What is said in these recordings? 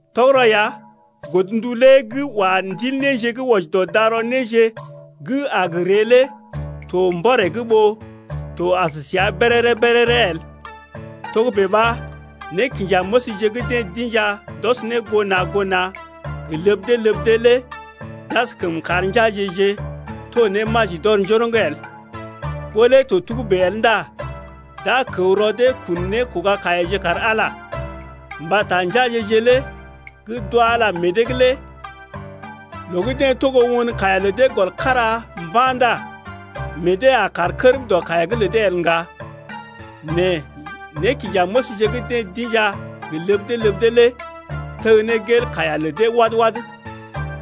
Tɔgərɔ ya godndu lé gə́ wa ndil néje gə́ wɔji dɔ darɔ néje gə́ a gə ree lé to mbɔree’g ɓó to as səa béréré-béréré el. Togə́bè ɓa nékinjanéməsje gə́ deḛ d’inja d’ɔs ne goo na̰ goo na̰ gə ləb dee ləb dee lé d’askəm kar njeaje-je to ne maji d’ɔr njoroŋ el. Ɓó lé to togə́bè el ndá d’a kəw rɔ dee kun nékoga-kaiyaje kar Ala. Mbata njeaje-je lé gə́ d’wa Ala meḛ dee’g lé loo gə́ deḛ togo won kaiya lə dee gɔl kára mba̰ ndá meḛ dee a kaar kərm dɔ kaiya’g lə dee el ŋga. Nɛ nékinjanéməsje gə́ deḛ d’inja gə ləb dee ləb dee lé teg ne gel kaiya lə dee wad-wad.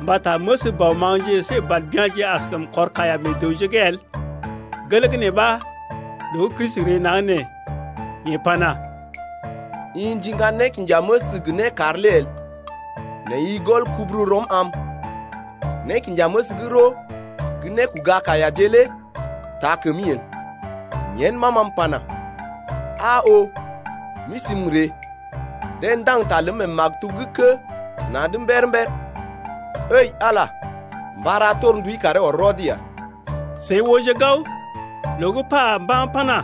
Mbata məs bɔ maŋgje əsé bàl bya̰je askəm kɔr kaiya meḛ dəwje’g el. Gelee gə́ nee ɓa, loo gə́ Kristi ree naŋg nee yeḛ pana: I ndiŋga nékinjaməs gə nékar lé el, Nɛ i gɔl kubururɔm am, Nékinjaməs gə́ roo gə nékoga-kaiyaje lé taa kəmi el. Yen ɓa ma m’pana: Aa oo, m’isi m’ree. (Deḛ ndaŋg ta ləm mee maktub gə́ kə́ na̰’d mber-mber) Ǝi Ala lé, mba ra torndui karee ɔr rɔd ya. Seḭ ooje gao, loo gə́ pa mba̰ pana: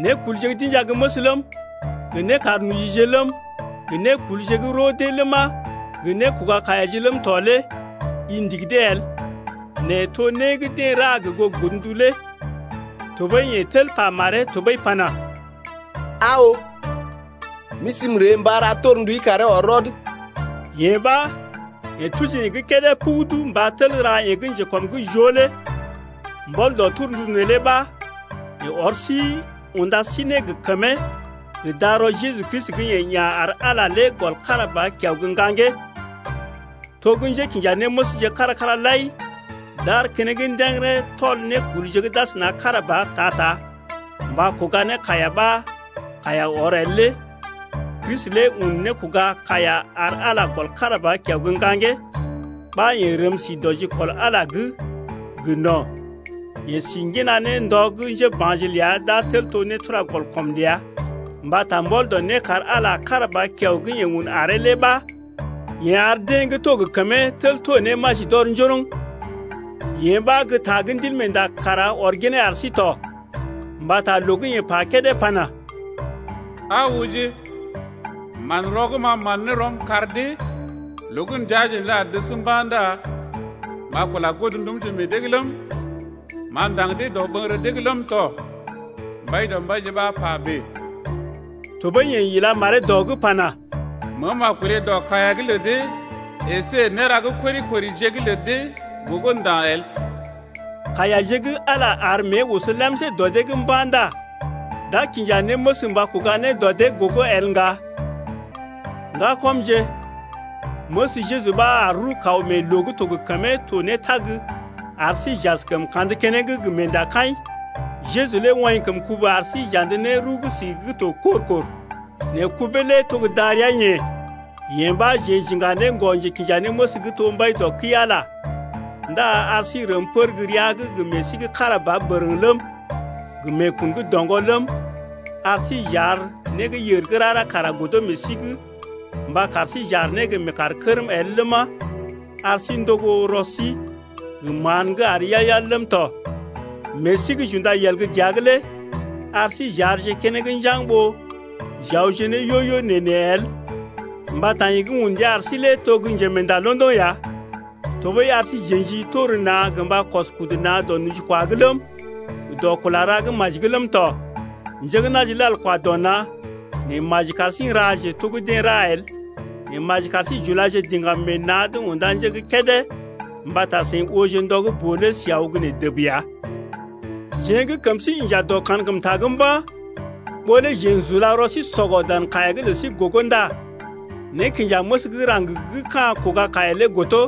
Nékulje gə́ d’inja gə́ məs ləm, gə nékarnojije ləm, gə nékulje gə́ roo dee ləma, gə nékoga-kaiyaje ləm tɔ lé i ndigi dee el (nɛ to né gə́ deḛ ra gə goo godndu lé). Tɔɓəi yeḛ tel pa maree tɔɓəi pana: Aa oo, m’isi m’ree mba ra torndui karee ɔr rɔd ya. Yee ɓa yeḛ tuji yee gə́ kédé pugudu mba tel ra yee gə́ njekɔm’g joo lé. Mbɔl dɔ torndu neelé ɓa yeḛ ɔr sí unda sí ne gə kəmee gə darɔ Jeju Kristi gə́ yeḛ ya̰ ar Ala lé gɔl kára ba kiao gə́ ŋgaŋgee. To gə́ njékinjanéməsje kára-kára lai d’aar keneŋ ndə̰gərə tɔl nékulje gə́ d’asəna kára ba ta-ta mba kuga ne kaiya ɓa kaiya ɔr el lé Kristi lé un nékòga kaiya ar Ala gɔl kára ba kiao gə́ ŋgaŋgee ɓa yeḛ rəm sí dɔ jikɔl Ala’g gə no̰. Yeḛ si ŋgina ne ndɔ gə́ njéba̰je ləa d’a tel to nétura-gɔl-kɔm ləa. Mbata mbɔl dɔ nékar Ala kára ba kiao gə́ yeḛ un aree lé ɓa yeḛ ar deḛ gə́ to gə kəmee tel to ne maji d’ɔr njoroŋ. Yee ɓa gə́ ta gə́ Ndilmeenda kara ɔr ginee ar sí tɔ, mbata loo gə́ yeḛ kédé pana: Aa ooje, manrɔ gə́ m’a man ne rɔm kar dee Loo gə́ ndəaje neelé a dəs mba̰ ndá M’a kula godndumje meḛ dee’g ləm, M’a ndaŋg dee dɔɓəŋgərə dee’g ləm tɔ. Mbaidɔmbaije ɓa pa bèe: Tɔɓəi yeḛ ila maree dɔ’g pana: Meem a kolé dɔ kaiya’g lə dee əsé néra gə́ kori-korije’g lə dee gogo nda̰ el. Kaiyaje gə́ Ala ar mée oso lemsé dɔ dee’g mba̰ ndá d’a kinja néməs mba kuga ne dɔ dee’g gogo el ŋga. Ŋgakɔmje, məs Jeju ɓa ar rəw-kaw mee loo gə́ to gə kəmee to ne tag ar sí j’askəm kandə keneŋ gə meendakaḭ. Jeju lé woḭ kəm kubu ar sí j’andə ne rəw gə́ sigi gə́ to kor-kor. Nɛ kubee lé to gə́ darəa-yeḛ. Yee ɓa jeḛ j’iŋga ne ŋgɔ-njekinjanéməs gə́ to mbai dɔ kəi-Ala ndá ar sí n’rəm pər gə́ rəa’g gə meḛ sí gə́ kára ba bərəŋ ləm, gə meekun gə́ doŋgɔ ləm, ar sí j’ar né gə́ yèr gə́ rara kara godo meḛ sí’g mba kar sí j’aar ne gə meekaar kərm el ləma, ar sí n’togo rɔ sí gə mán gə́ àr yal-yal ləm tɔ. Meḛ sí gə́ j’unda yel gə́ dəa’g lé ar sí j’aarje keneŋ njaŋg ɓó j’awje ne yo-yo nee-nee el mbata yeḛ gə́ un ndia ar sí lé to gə́ njemeenda londoŋ ya. Tɔɓəi ar sí j’ə̰ji tor na̰ gə mba kɔs kudu na̰ dɔ nojikwa’g ləm, gə dɔ kula ra gə́ maji’g ləm tɔ. Njé gə́ na̰je lal kwa dɔ na̰, nɛ maji kar sí n’raje to gə́ deḛ ra el. Nɛ maji kar sí j’ulaje diŋgam meḛ na̰’d unda nje gə́ kédé mbata seḭ ooje ndɔ gə́ boo lé si aw gə́ nee dəb ya. Jeḛ gə́ kəm sí inja dɔ kankəmta’g mba̰, ɓó lé jeḛ n’sula rɔ sí sɔgɔ dan kaiya’g lə sí gogo ndá nékinjaməs gə́ raŋg gə́ ka̰ kuga kaiya lé godo.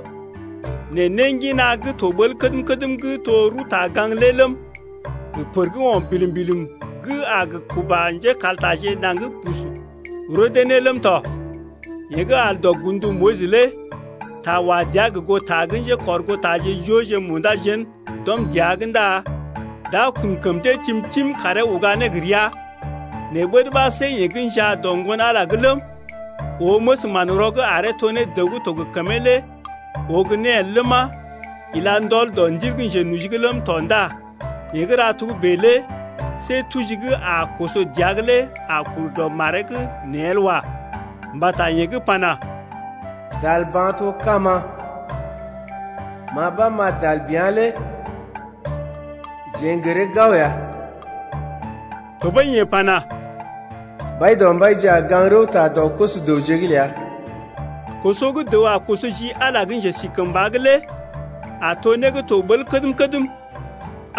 Nɛ néngina gə́ to ɓəl kədm-kədm gə́ to rəwta-gaŋg lé ləm, gə pər gə́ o̰ bilim-bilim gə́ a gə kuba njékaltaje naŋg bus roo dee ne ləm tɔ. Yeḛ gə́ al dɔ godndu Moyis lé ta wa dəa gə goo ta gə́ njékɔrgootaje jooje munda jén d’ɔm dəa’g ndá d’a kun kəm dee tim-tim karee uga ne gə rəa. Nɛ ɓəd ɓa see yeḛ gə́ njaa dɔ Ŋgon-Ala’g lé ləm, oo məs manrɔ gə́ aree to ne dəw gə́ to gə kəmee lé oo gə́ né el ləma, ila ndɔl dɔ Ndil gə́ njenoji’g ləm tɔ ndá yeḛ gə́ ra togə́bè lé see tuji gə́ a koso dəa’g lé a kur dɔ maree’g nee el wa. Mbata yeḛ gə́ pana: Dal ba̰ to kama, ma ɓa m’a dal bea̰ lé jeḛ n’gəree gao ya. Tɔɓəi yeḛ pana: Mbaidɔmbaije a gaŋg-rəwta dɔ koso-dəwje’g ləa. Koso gə́ dəw a koso ji Ala gə́ njesikəmba’g lé a to né gə́ to ɓəl kədm-kədm.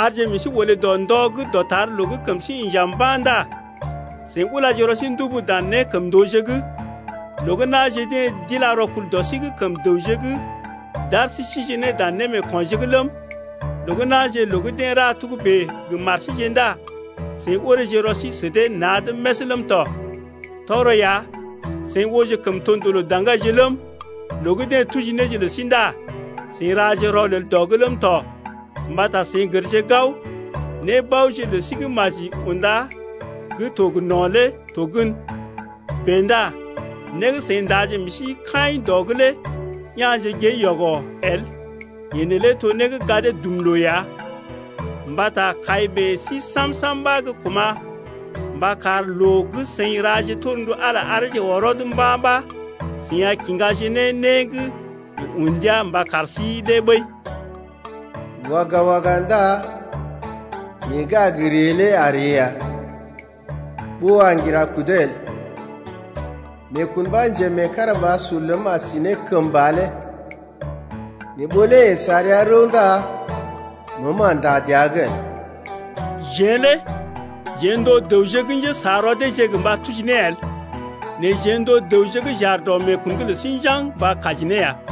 Arje meḛ sí olé dɔ ndɔ gə́ dɔtar loo gə́ kəm sí inja mba̰ ndá seḭ ulaje rɔ sí ndubu dan nékəmndooje’g. Loo gə́ na̰je deḛ d’ila rɔkul dɔ sí’g kəm dəwje’g d’ar sí sije ne dan némeekonje’g ləm, loo gə́ na̰je loo gə́ deḛ ra togə́bè gə mar síje ndá seḭ oreeje rɔ sí sə dee na̰’d més ləm tɔ. Tɔgərɔ ya seḭ ooje kəmtondoo lə daŋgaije ləm, loo gə́ deḛ tuji néje lə sí ndá seḭ raje rɔlel dɔ’g ləm tɔ mbata seḭ gərje gao, nébaoje lə sí gə́ maji unda gə́ to gə no̰ lé to gən. Bèe ndá né gə́ seḭ ndaje meḛ sí kaḭ dɔ’g lé ya̰je gée yɔgɔ el, yee neelé to né gə́ gadee dum loo ya. Mbata kai meḛ sí sam-sam ɓa gə́ kuma̰ mba kar loo gə́ seḭ raje torndu Ala areeje ɔr rɔd mba̰ ɓa seḭ a kiŋgaje ne né gə́ yeḛ un ndia mba kar sí lé ɓəi. Waga, waga ndá yeḛ gə́ a gə ree lé a ree ya Ɓó a ŋgira kudee el. Meekun ɓa njemeekarabasur ləm a si ne kəmba lé Nɛ ɓó lé yeḛ sa rəa rəw ndá məəm a ndá dəa’g el. Jeḛ lé jeḛ n’to dəwje gə́ njésa rɔ deeje gə mba tuji ne el. Nɛ jeḛ n’to dəwje gə́ j’aar dɔ meekun’g lə sí njaŋg mba kaji ne ya.